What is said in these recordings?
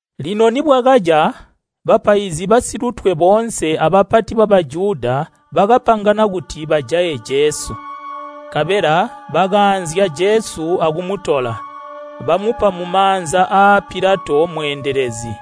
Lino nibwakaca, bapaizi basilutwe boonse abapati ba Bajuda bakapangana kuti bajaye Jesu. Nkabela bakaanzya Jesu akumutola, bamupa mumaanza aa Pilato mweendelezi,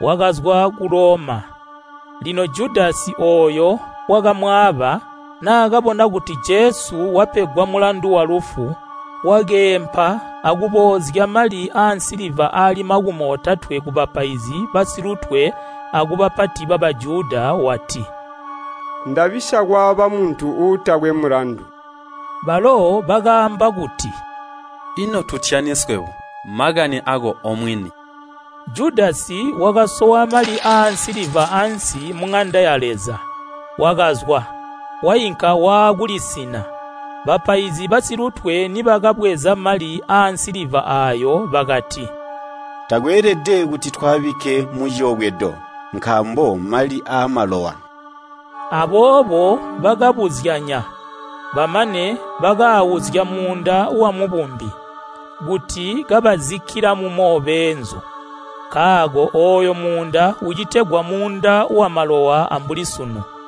wakazwa ku Loma. Lino Judasi ooyo wakamwaaba, naakabona kuti Jesu wapegwa mulandu walufu, wakeempa akuboozya mali aansiliva aali makumi otatwe kubapaizi basilutwe akubapati ba Bajuda wati, “Ndabisya kwaaba muntu uutakwe mulandu.” Balo bakaamba kuti, “Ino tutyani swebo? Makani aako omwini.” Judasi wakasowa mali aansiliva ansi muŋanda ya Leza, wakazwa, wainka waakulisina. Bapaizi basilutwe nibakabweza mali aansiliva aayo bakati, “Takweelede kuti twaabike muciyobwedo, nkaambo mali aamalowa.” Aboobo bakabuzyanya, bamane bakaauzya muunda wamubumbi, kuti kabazikkila mumo beenzu. Nkaako ooyo muunda ucitegwa muunda wamalowa ambuli sunu.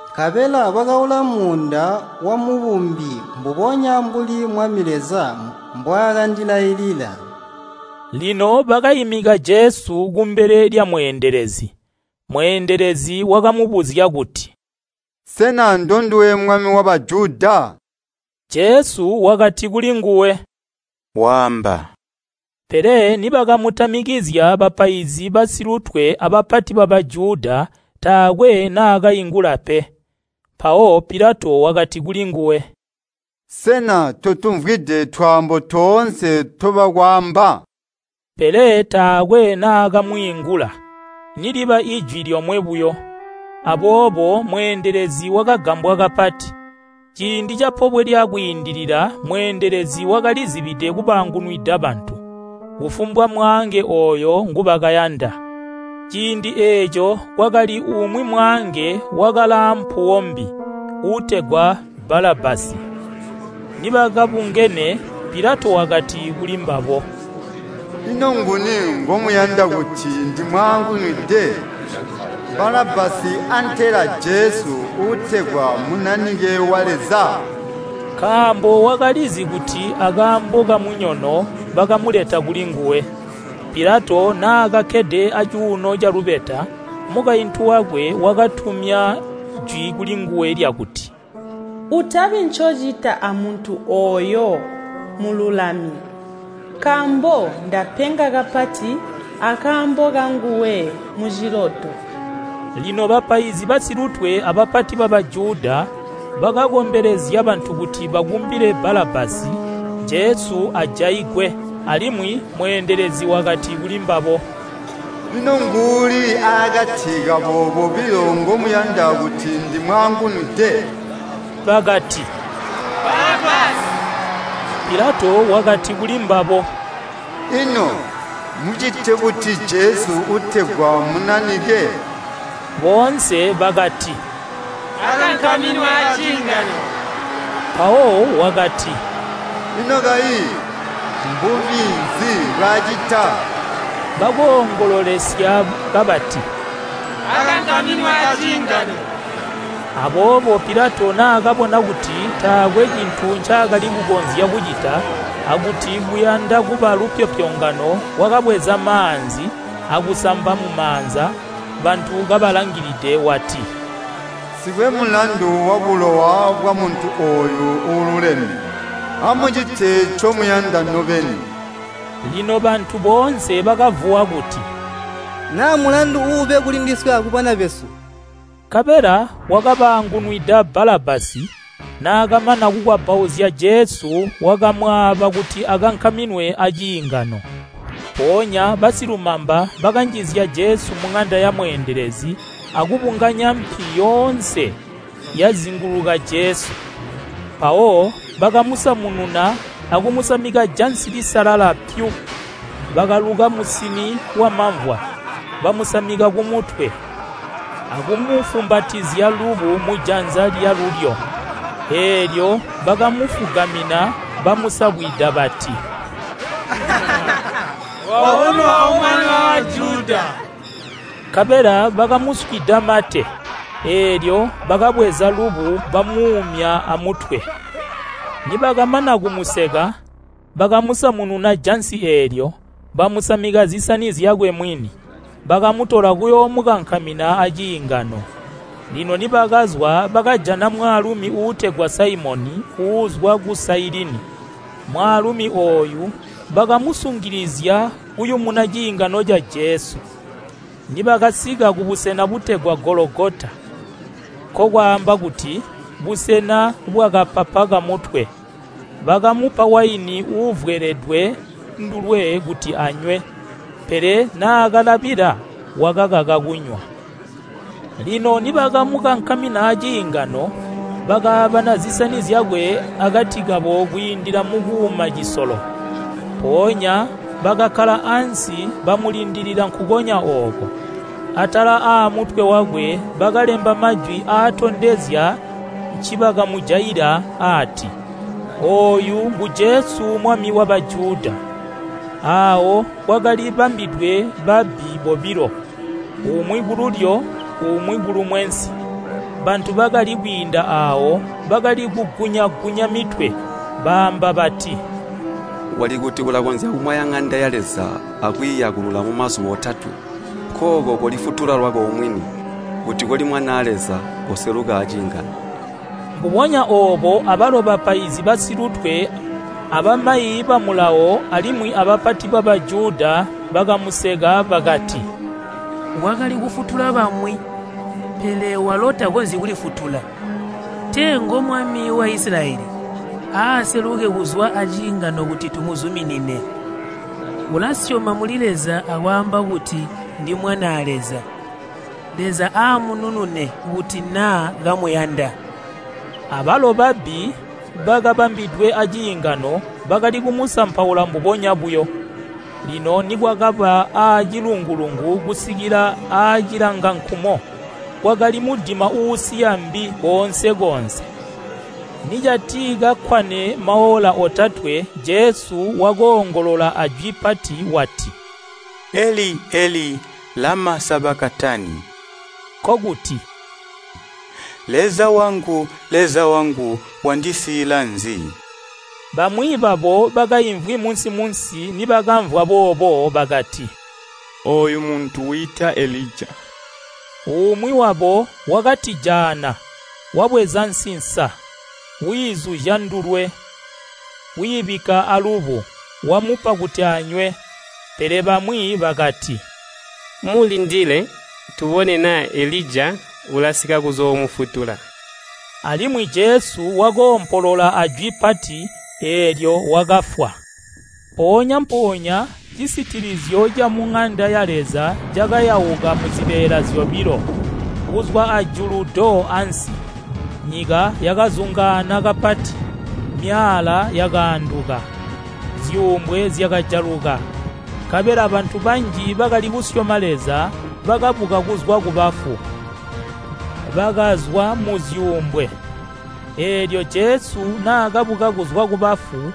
nkabela bakaula muunda wamubumbi mbubonya mbuli Mwami Leza mbwaakandilailila.” Lino bakaimika Jesu kumbele lyamweendelezi, mweendelezi wakamubuzya kuti, “Sena ndonduwe Mwami wa Bajuda?” Jesu wakati kulinguwe, “Waamba.” Pele nibakamutamikizya bapaizi basilutwe abapati ba Bajuda taakwe naakaingula pe. Mpawo Pilato wakati kulinguwe, “Sena totumvwide twaambo toonse ntobakwaamba?” Pele taakwe naakamwiingula, niliba ijwi lyomwe buyo, aboobo mweendelezi wakagambwa kapati. Ciindi ca Pobwe lya Kwiindilila mweendelezi wakalizibide kubaangunwida bantu, kufumbwa mwaange ooyo ngubakayanda. Ciindi eeco kwakali umwi mwaange wakalaampuwo mbi, uutegwa Balabbasi. Nibakabungene, Pilato wakati kulimbabo, “Ino nguni ngomuyanda kuti ndimwaangunwide, Balabbasi antela Jesu uutegwa Munanike wa Leza?” Nkaambo wakalizi kuti akaambo kamunyono bakamuleta kulinguwe. Pilato naakakkede acuuno calubeta, mukaintu wakwe wakatumya jwi kulinguwe lyakuti, “Utabi ncocita amuntu ooyo mululami, nkaambo ndapenga kapati akaambo kanguwe muciloto.” Lino bapaizi basilutwe abapati ba Bajuda bakakombelezya bantu kuti bakumbile Balabbasi, Jesu ajaigwe. Alimwi mweendelezi wakati kulimbabo, “Ino nguuli aakati kabo bobilo ngomuyanda kuti ndimwaangunwide?” Bakati, “Balabbasi.” Pilato wakati kulimbabo, “Ino mmucite buti Jesu uutegwa Munanike?” Boonse bakati, “Akankaminwe aciingano.” Mpawo wakati “Ino kayi, mbubi nzi mbwaacita?” Bakoongololesya kabati, “Akankaminwe aciingano.” Aboobo Pilato naakabona kuti taakwe cintu ncaakali kukonzya kucita, akuti kuyanda kuba lupyopyongano wakabweza maanzi akusamba mumaanza bantu kabalangilide wati, “Nsikwe mulandu wabulowa bwamuntu ooyu uululeme. Amucite ncomuyanda nobeni.” Lino bantu boonse bakavuwa kuti, “Naa mulandu uube kulindiswe akubana besu.” Nkabela wakabaangunwida Balabbasi, naakamana kukwabbauzya Jesu wakamwaaba kuti akankaminwe aciingano. Mpoonya basilumamba bakanjizya Jesu muŋanda ya mweendelezi akubunganya mpi yoonse yazinguluka Jesu. Mpawo bakamusamununa akumusamika jansi lisalala pyu. Bakaluka musini wamamvwa bamusamika kumutwe, akumufumbatisya lubu mujanza lyalulyo. Eelyo bakamufugamina bamusabwida bati, “Wabonwa O Mwami wa Bajuda.” Nkabela bakamuswida mate, eelyo bakabweza lubu bamuumya amutwe. Nibakamana kumuseka, bakamusamununa jansi eelyo, bamusamika zisani zyakwe mwini, bakamutola kuyoomukankamina aciingano. Lino nibakazwa bakajana mwaalumi uutegwa Saimoni uuzwa ku Sailini. Mwaalumi ooyu bakamusungilizya kuyumuna ciingano ca Jesu. Nibakasika kubusena butegwa Gologota, “Nkokwaamba kuti, Busena bwakapapa kamutwe” bakamupa waini uuvweledwe ndulwe kuti anywe, pele naakalabila wakakaka kunywa. Lino nibakamukankamina aciingano, bakaabana zisani zyakwe akati kabo kwiindila mukuuma cisolo. Mpoonya bakakkala ansi bamulindilila nkukonya ooko. Atala aamutwe wakwe bakalemba majwi aatondezya ncibakamujaila, aati, “Ooyu ngu Jesu Mwami wa Bajuda.” Aawo kwakali bambwidwe babbi bobilo, umwi kululyo umwi kulumwensi. Bantu bakali kwiinda aawo bakali kugunya-gunya mitwe, baamba bati, “Wali kuti ulakonzya kumwaya ŋanda ya Leza akwiiyakulula mumazuba otatwe. Nkooko kolifutula lwako omwini, kuti koli Mwanaa Leza koseluka aciingano.” Mbubonya oobo abalo bapaizi basilutwe abamayi ba Mulawo alimwi abapati ba Bajuda bakamuseka bakati, “Wakali kufutula bamwi, pele walo takonzyi kulifutula. Tee ngo Mwami wa Isilayeli, aaseluke kuzwa aciingano kuti tumuzuminine. Ulasyoma muli Leza akwaamba kuti, ‘Ndi Mwanaa Leza.’ Leza aamununune, kuti naa kamuyanda.” Abalo babbi bakabambwidwe aciingano bakali kumusampaula mbubonya buyo. Lino nikwakaba aacilungu-lungu kusikila aacilangankumo kwakali mudima uusiya mbi koonse-koonse. Nicatikakkwane maola otatwe Jesu wakoongolola ajwi pati wati, “Eli, Eli lama sabakatani?” Nkokuti, “Leza wangu, Leza wangu, wandisiila nzi?” Bamwi babo bakaimvwi munsi-munsi nibakamvwa boobo bakati, “Ooyo muntu wiita Elija.” Umwi wabo wakatijaana, wabweza nsinsa, wiizuzya ndulwe, wiibikka alubu, wamupa kuti anywe. Pele bamwi bakati, “Mulindile, tubone naa Elija ulasika kuzoomufutula.” Alimwi Jesu wakoompolola ajwi pati, eelyo wakafwa. Mpoonya-mpoonya cisitilizyo camuŋanda ya Leza cakayauka muzibeela zyobilo, kuzwa ajulu do ansi. Nyika yakazungaana kapati, myaala yakaanduka. Zyuumbwe zyakajaluka, nkabela bantu banji bakali kusyoma Leza bakabuka kuzwa kubafu. Bakazwa muzyuumbwe, eelyo Jesu naakabuka kuzwa kubafu,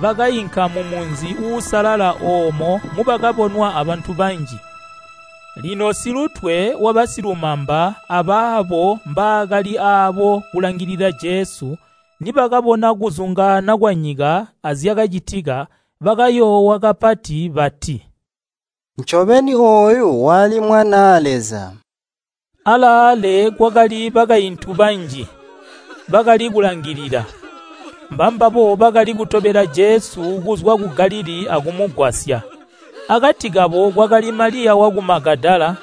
bakainka mumunzi uusalala oomo mubakabonwa abantu banji. Lino silutwe wabasilumamba abaabo mbaakali aabo kulangilila Jesu, nibakabona kuzungaana kwanyika azyakacitika, bakayoowa kapati bati, “Ncobeni, ooyu wali Mwanaa Leza.” Alaale kwakali bakaintu banji, bakali kulangilila. Mbambabo bakali kutobela Jesu kuzwa ku Galilii akumugwasya. Akati kabo kwakali Maliya waku Magadala,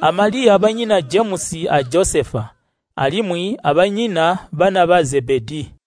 a Maliya banyina Jemusi a Josefa, alimwi abanyina bana ba Zebedii.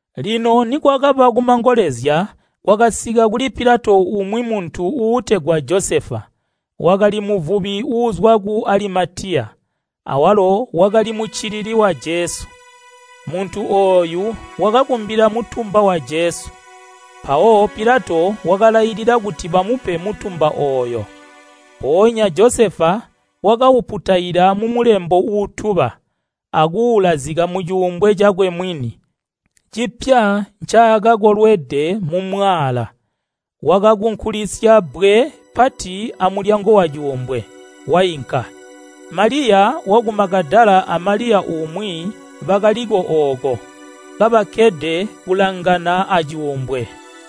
Lino nikwakaba kumangolezya, kwakasika kuli Pilato umwi muntu uutegwa Josefa. Wakali muvubi uuzwa ku Alimatiya, awalo wakali muccilili wa Jesu. Muntu ooyu wakakumbila mutumba wa Jesu. Mpawo Pilato wakalailila kuti bamupe mutumba ooyo. Mpoonya Josefa, wakauputaila mumulembo uutuba, akuulazika mucuumbwe cakwe mwini, cipya ncaakakolwede mumwaala. Wakakunkulisya bbwe pati amulyango wacuumbwe, wainka. Maliya waku Magadala a Maliya umwi bakaliko ooko, kabakkede kulangana aacuumbwe.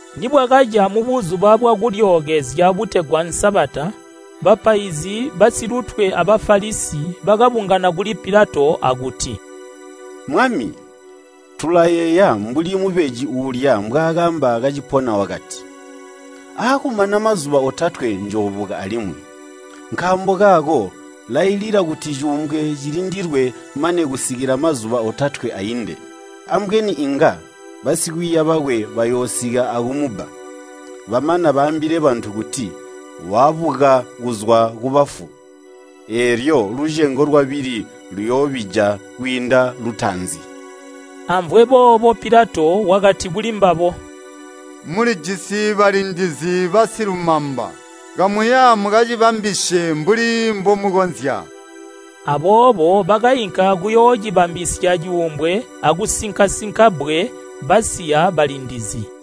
Nibwakaca mu Buzuba bwa Kulyookezya butegwa Sabata, bapaizi basilutwe a Bafalisi bakabungana kuli Pilato akuti, “Mwami, tulayeeya mbuli mubeji uulya mbwaakaamba kacipona wakati, ‘Aakumana mazuba otatwe njoobuka alimwi.’ Nkaambo kaako lailila kuti cuumbwe cilindilwe mane kusikila mazuba otatwe ainde. Ambweni inga basikwiiya bakwe bayoosika akumubba, bamana baambile bantu kuti, ‘Wabuka kuzwa kubafu.’ Eelyo lucengo lwabili luyoobija kwiinda lutaanzi.” Amvwe boobo Pilato wakati kuli mbabo, “Mulijisi balindizi basilumamba, Kamuya mukacibambisye mbuli mbomukonzya.” Aboobo bakainka akuyoocibambisya cuumbwe akusinka-sinka bbwe basiya balindizi.